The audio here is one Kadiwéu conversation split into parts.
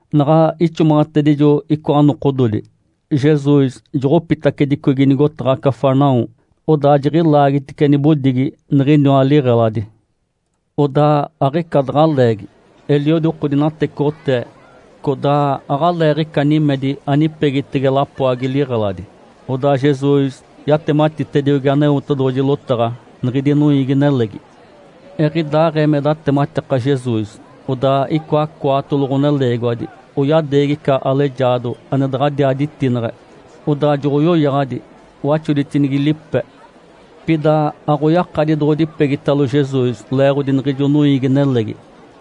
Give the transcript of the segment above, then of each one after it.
Naɡ̶a ixomaɡ̶atedijo icoa nokododi, Jesus joɡ̶opitacedicogi nigotaɡ̶a Cafarnaum. Odaa jiɡ̶ilaagitice nibodigi niɡ̶iniwa liɡ̶eladi. Odaa aɡ̶ica daɡ̶a leegi eliodi oko dinatecoɡ̶otee, codaa aɡ̶aleeɡ̶ica nimedi anipegitege lapoagi liɡ̶eladi. Odaa Jesus yatematitediogi Aneotedoɡ̶oji lotaɡ̶a niɡ̶idi noiigi-nelegi. Eɡ̶idaaɡ̶ee me datematika Jesus, odaa icoa cwaatolo ɡ̶oneleegiwadi oyadeegi ica alejaado ane daɡ̶adiaa ditineɡ̶e, odaa joɡ̶oyoyaɡ̶adi waxoditinigi lipe. Pida aɡ̶oyakadi doɡ̶odipegitalo Jesus leeɡ̶odi niɡ̶ijo noiigi-nelegi.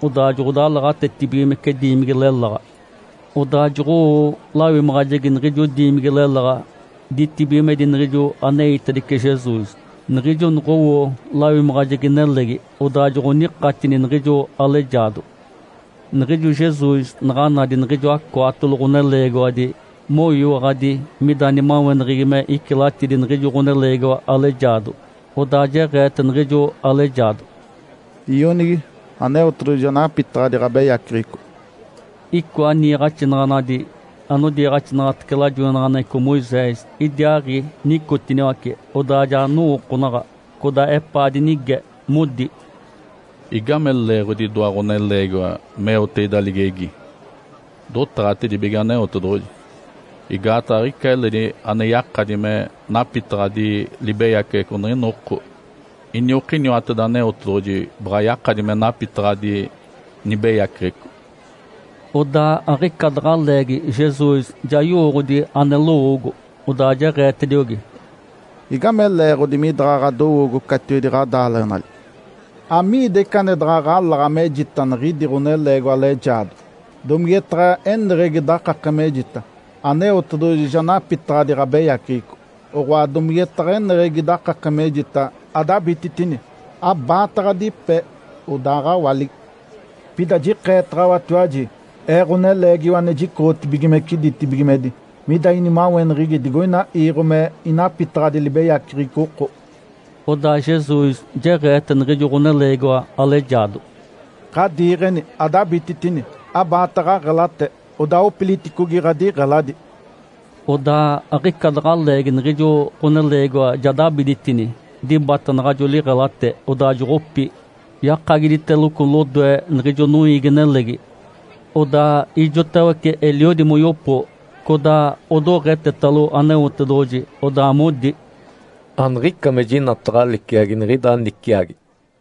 Odaa joɡ̶odalaɡ̶atetibigimece diimigi leláɡ̶a, odaa joɡ̶owo lawimaɡ̶ajegi niɡ̶ijo diimigi leláɡ̶a, ditibigimedi niɡ̶ijo aneitedice Jesus. Niɡ̶ijo noɡ̶owo lawimaɡ̶ajegi nelegi, odaa joɡ̶onikatini niɡ̶ijo alejaado. Niɡ̶ijo Jesus naɡ̶a nadi niɡ̶ijoa cwaatolo ɡ̶oneleegiwadi moyiwaɡ̶adi mida nimaweneɡ̶egi me icilatidi niɡ̶ijo ɡ̶oneleegiwa alejaado, odaa jeɡ̶eete niɡ̶ijo alejaado, “Ionigi, Aneotedoɡ̶oji ja napitaɡ̶adi ɡ̶abeyaceɡ̶eco!” Icoa niiɡ̶axinaɡ̶anadi anodiiɡ̶axinaɡ̶atece lajoinaɡ̶aneɡ̶eco Moisés idiaaɡ̶i nicotiniwace. Odaa ja nowookonaɡ̶a, codaa epaa dinige, modi, “Igame leeɡ̶odi idoa ɡ̶oneleegiwa meote ida ligegi? Dotaɡ̶atedibige Aneotedoɡ̶oji. Igaataɡ̶a aɡ̶ica eledi ane yakadi me napitaɡ̶adi libeyaceɡ̶eco niɡ̶ina oko. Iniokiniwateda Aneotedoɡ̶oji baɡ̶a yakadi me napitaɡ̶adi nibeyaceɡ̶eco.” Odaa aɡ̶ica daɡ̶a leegi Jesus ja yowooɡ̶odi ane lowoogo, odaa jeɡ̶eetediogi, “Igame leeɡ̶odi midaɡ̶a ɡ̶adowoogo catiwedi ɡ̶adaaleɡ̶enali? Amigida ica ane daɡ̶a ɡ̶alaɡ̶a mejita niɡ̶idi ɡ̶oneleegiwa alejaado? Domigetaɡ̶a eneɡ̶egi dakake mejita, ‘Aneotedoɡ̶oji ja napitaɡ̶adi ɡ̶abeyaceɡ̶eco’, oɡ̶oa, domigetaɡ̶a eneɡ̶egi dakake mejita, ‘Adabititini, abaata ɡ̶adipe, odaaɡ̶awaligi!’? Pida jikeetaɡ̶awatiwaji, Ee, Ǥoneleegiwa ane jicoɡ̶otibigimece ditibigimedi, mida inimaweneɡ̶egi digoina iiɡ̶o me inapitaɡ̶adi libeyaceɡ̶eco oko.” Odaa Jesus jeɡ̶eete niɡ̶ijo ɡ̶oneleegiwa alejaado, “Ǥadiiɡ̶eni, adabititini, abaata ɡ̶aɡ̶elate, odaa opiliticogi ɡ̶adiɡ̶eladi!” Odaa aɡ̶ica daɡ̶a leegi niɡ̶ijo ɡ̶oneleegiwa ja dabiditini, dibata naɡ̶ajo liɡ̶elate, odaa joɡ̶opi, yakagiditeloco lodoe niɡ̶ijo noiigi-nelegi. Odaa ijotawece eliodi moyopo, codaa odoɡ̶etetalo Aneotedoɡ̶oji, odaa modi, “Aniɡ̶ica me jinataɡ̶a liciagi niɡ̶ida niciagi!”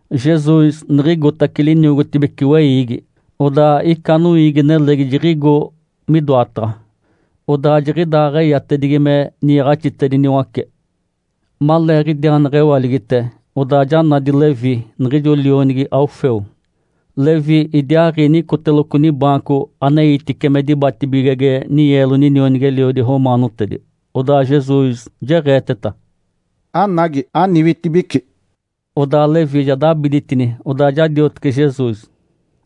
Jesus niɡ̶igotace liniogotibece weiigi. Odaa ica noiigi-nelegi jiɡ̶igo midoataɡ̶a, odaa jiɡ̶idaaɡ̶eyatedigi me niiɡ̶axitediniwace. Maleeɡ̶idiaa neɡ̶ewaligite, odaa ja nadi Levi, niɡ̶ijo lionigi Alfeu. Levi idiaaɡ̶i nicoteloco nibaanco aneitice me dibatibigege ninyeelo ninionigi-eliodi romaanotedi. Odaa Jesus jeɡ̶eeteta, “Anagi, aniwitibici!” Odaa Levi ja dabiditini, odaa ja diotece Jesus.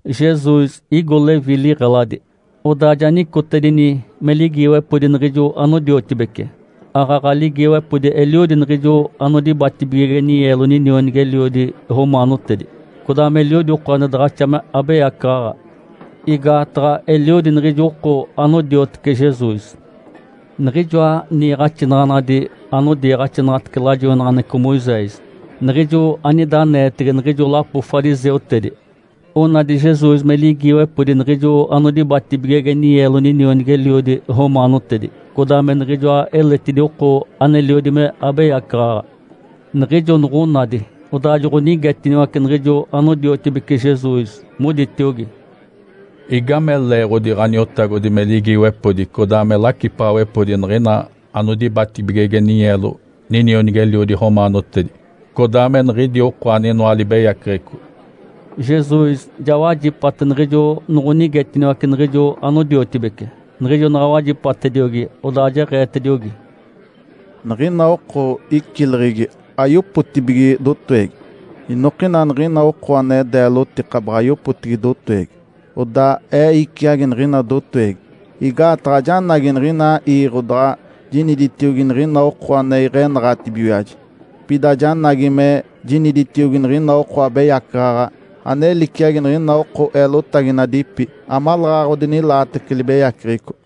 Jesus igo Levi liɡ̶eladi. Odaa ja nicotedini me ligiiwepodi niɡ̶ijo anodiotibece. Aaɡ̶aɡ̶a ligiiwepodi eliodi niɡ̶ijo anodibatibigege ninyeelo ninionigi-eliodi romaanotedi, codaa meliodi oko ane daɡ̶axa me abeyacaɡ̶aɡ̶a, igaataɡ̶a eliodi niɡ̶ijo oko anodiotece Jesus. Niɡ̶ijoa niiɡ̶axinaɡ̶anadi anodiiɡ̶axinaɡ̶atece lajoinaɡ̶aneɡ̶eco Moisés, niɡ̶ijo anida aneetege niɡ̶ijo lapo fariseutedi, onadi Jesus me ligiiwepodi niɡ̶ijo anodibatibigege ninyeelo ninionigi-eliodi romaanotedi, codaa me niɡ̶ijoa eletidi oko aneliodi me abeyacaɡ̶aɡ̶a. Niɡ̶ijo noɡ̶onadi, odaa joɡ̶onigetiniwace niɡ̶ijo anodiotibece Jesus, moditiogi, “Igame leeɡ̶odi Ǥaniotagodi me ligiiwepodi codaa me lacipaɡ̶awepodi niɡ̶ina anodibatibigege ninyeelo ninionigi-eliodi romaanotedi, codaa me niɡ̶idi oko aninoa libeyaceɡ̶eco?” Jesus ja wajipate niɡ̶ijo noɡ̶onigetiniwace niɡ̶ijo anodiotibece. Niɡ̶ijo naɡ̶a wajipatediogi, odaa jeɡ̶eetediogi, “Niɡ̶ina oko icileɡ̶egi ayopotibige dotowegi, inokina niɡ̶ina oko ane deelotika baɡ̶a yopotibige dotowegi. Odaa Ee iciagi niɡ̶ina dotowegi. Igaataɡ̶a ajanagi niɡ̶ina iiɡ̶o daɡ̶a jiniditiogi niɡ̶ina oko ane iɡ̶enaɡ̶atibigiwaji, pida janagi me jiniditiogi niɡ̶ina oko abeyacaɡ̶aɡ̶a, ane liciagi niɡ̶ina oko eelotaginadipi, amaleeɡ̶aɡ̶a odinilaatece libeyaceɡ̶eco.”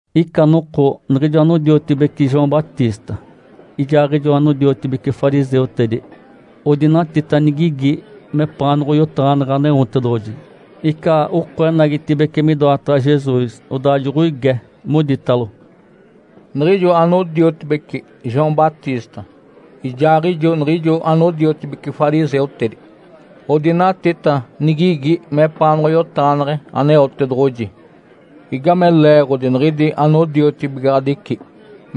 Ica noko niɡ̶ijo anodiotibeci João Batista ijaaɡ̶ijo anodiotibeci fariseutedi odinatita nigigi mepaanoɡ̶oyotaɡ̶aneɡ̶e Aneotedoɡ̶oji. Ica oko enagitibeci midoataɡ̶a Jesus, odaa joɡ̶oige, moditalo, “Niɡ̶ijo anodiotibeci João Batista ijaaɡ̶ijo niɡ̶ijo anodiotibeci fariseutedi odinatita nigigi mepaanoɡ̶oyotaɡ̶aneɡ̶e Aneotedoɡ̶oji. Igame leeɡ̶odi niɡ̶idi anodiotibigaɡ̶adici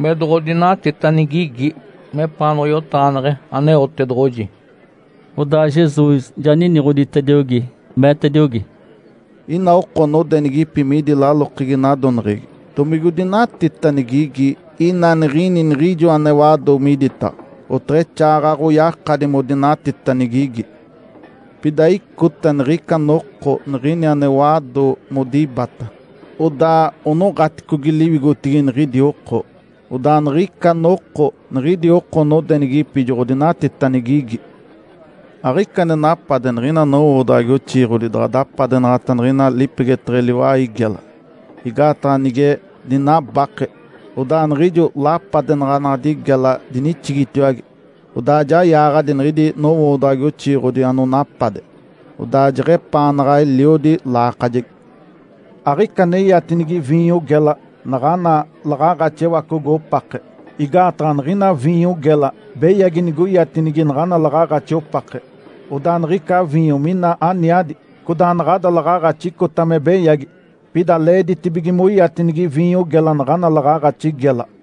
me doɡ̶odinatita nigigi mepaanoɡ̶oyotaɡ̶aneɡ̶e Aneotedoɡ̶oji?” Odaa Jesus ja niniɡ̶oditediogi, meetediogi, “Ina oko nodenigipi midi lalokegi nadoneɡ̶egi, domigodinatita nigigi ina nigini niɡ̶ijo ane wado miditaɡ̶a? Oteɡ̶exaaɡ̶aɡ̶oyakadi modinatita nigigi! Pida icota niɡ̶ica noko niɡ̶ini ane wado modibata, odaa onoɡ̶aticogi liwigotigi niɡ̶idi oko. Odaa niɡ̶ica noko niɡ̶idi oko nodenigipi joɡ̶odinatita nigigi. Aɡ̶ica ane napade niɡ̶ina nowoodaɡ̶agi oxiiɡ̶odi daɡ̶a dapadenaɡ̶ata niɡ̶ina lipegeteɡ̶e liwai gela, igaataɡ̶a nige dinabake, odaa niɡ̶ijo lapadenaɡ̶anaɡ̶adi gela dinixigitiwage, odaa ja yaaɡ̶adi niɡ̶idi nowoodaɡ̶agi oxiiɡ̶odi anonapade, odaa jeɡ̶epaanaɡ̶a eliodi laakajegi. Aɡ̶ica ane iatinigi viinyo gela naɡ̶ana laɡ̶aaɡ̶axi ewacogo opake. Igaataɡ̶a niɡ̶ina viinyo gela beyagi nigoiatinigi naɡ̶ana laɡ̶aaɡ̶axi opake, odaa niɡ̶ica viinyo mina aniadi, codaa naɡ̶ada laɡ̶aaɡ̶axi icota me beyagi. Pida leeditibige moiatinigi viinyo gela naɡ̶ana laɡ̶aaɡ̶axi gela.”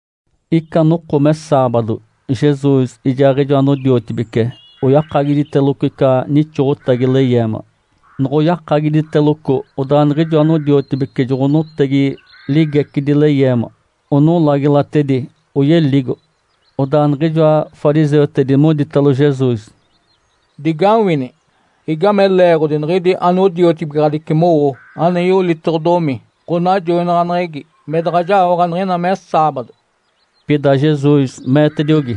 Ica noko me saabado Jesus ijaaɡ̶ijo anodiotibece oyakagiditeloco ica nixoɡ̶otagi leyeema. Noɡ̶oyakagiditeloco, odaa niɡ̶ijo anodiotibece joɡ̶onotegi ligecidi leyeema, onolagilatedi oyeligo. Odaa niɡ̶ijoa fariseutedi moditalo Jesus, “Digawini! Igame leeɡ̶odi niɡ̶idi anodiotibigaɡ̶adici mowo ane yolitoɡ̶odomi ɡ̶onajoinaɡ̶aneɡ̶egi me daɡ̶a jaoɡ̶a niɡ̶ina me saabado?” Pida Jesus meetediogi,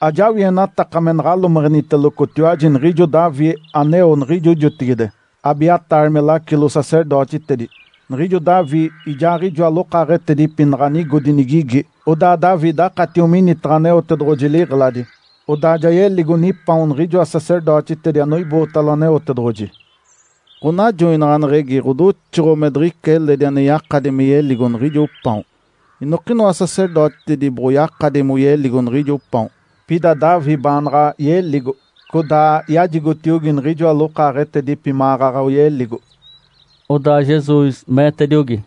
“Ajawienataka me naɡ̶alomeɡ̶enitelocotiwaji niɡ̶ijo Davi aneo niɡ̶ijo jotigide, Abiatar me lacilo-sacerdotitedi. Niɡ̶ijo Davi ijaaɡ̶ijoa lokaaɡ̶etedipi naɡ̶a nigodi nigigi, odaa Davi dakatio minitaɡ̶a Aneotedoɡ̶oji liɡ̶eladi, odaa ja yeligo nipaon niɡ̶ijoa sacerdotitedi anoibootalo Aneotedoɡ̶oji. Ǥonajoinaɡ̶aneɡ̶egi ɡ̶odoxoɡ̶o me diɡ̶ica eledi ane yakadi me yeligo niɡ̶ijo paon. Inokinoa sacerdotitedi boɡ̶oyakadi moyeligo niɡ̶ijo paon. Pida Davi baanaɡ̶a yeligo, codaa yajigotiogi niɡ̶ijoa lokaaɡ̶etedipi maɡ̶aɡ̶a oyeligo.” Odaa Jesus meetediogi,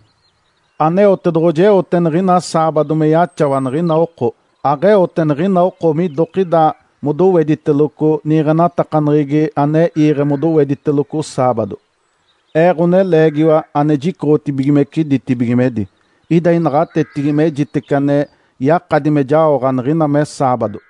“Aneotedoɡ̶oji eote niɡ̶ina saabado me yaxawa niɡ̶ina oko. Aɡ̶eote niɡ̶ina oko midokida modowediteloco niiɡ̶enatakaneɡ̶egi ane iiɡ̶e modowediteloco saabado. Ee, Ǥoneleegiwa ane jicoɡ̶otibigimece ditibigimedi, ida inaɡ̶atetigi mejitece ane yakadi me jaoɡ̶a niɡ̶ina me saabado.”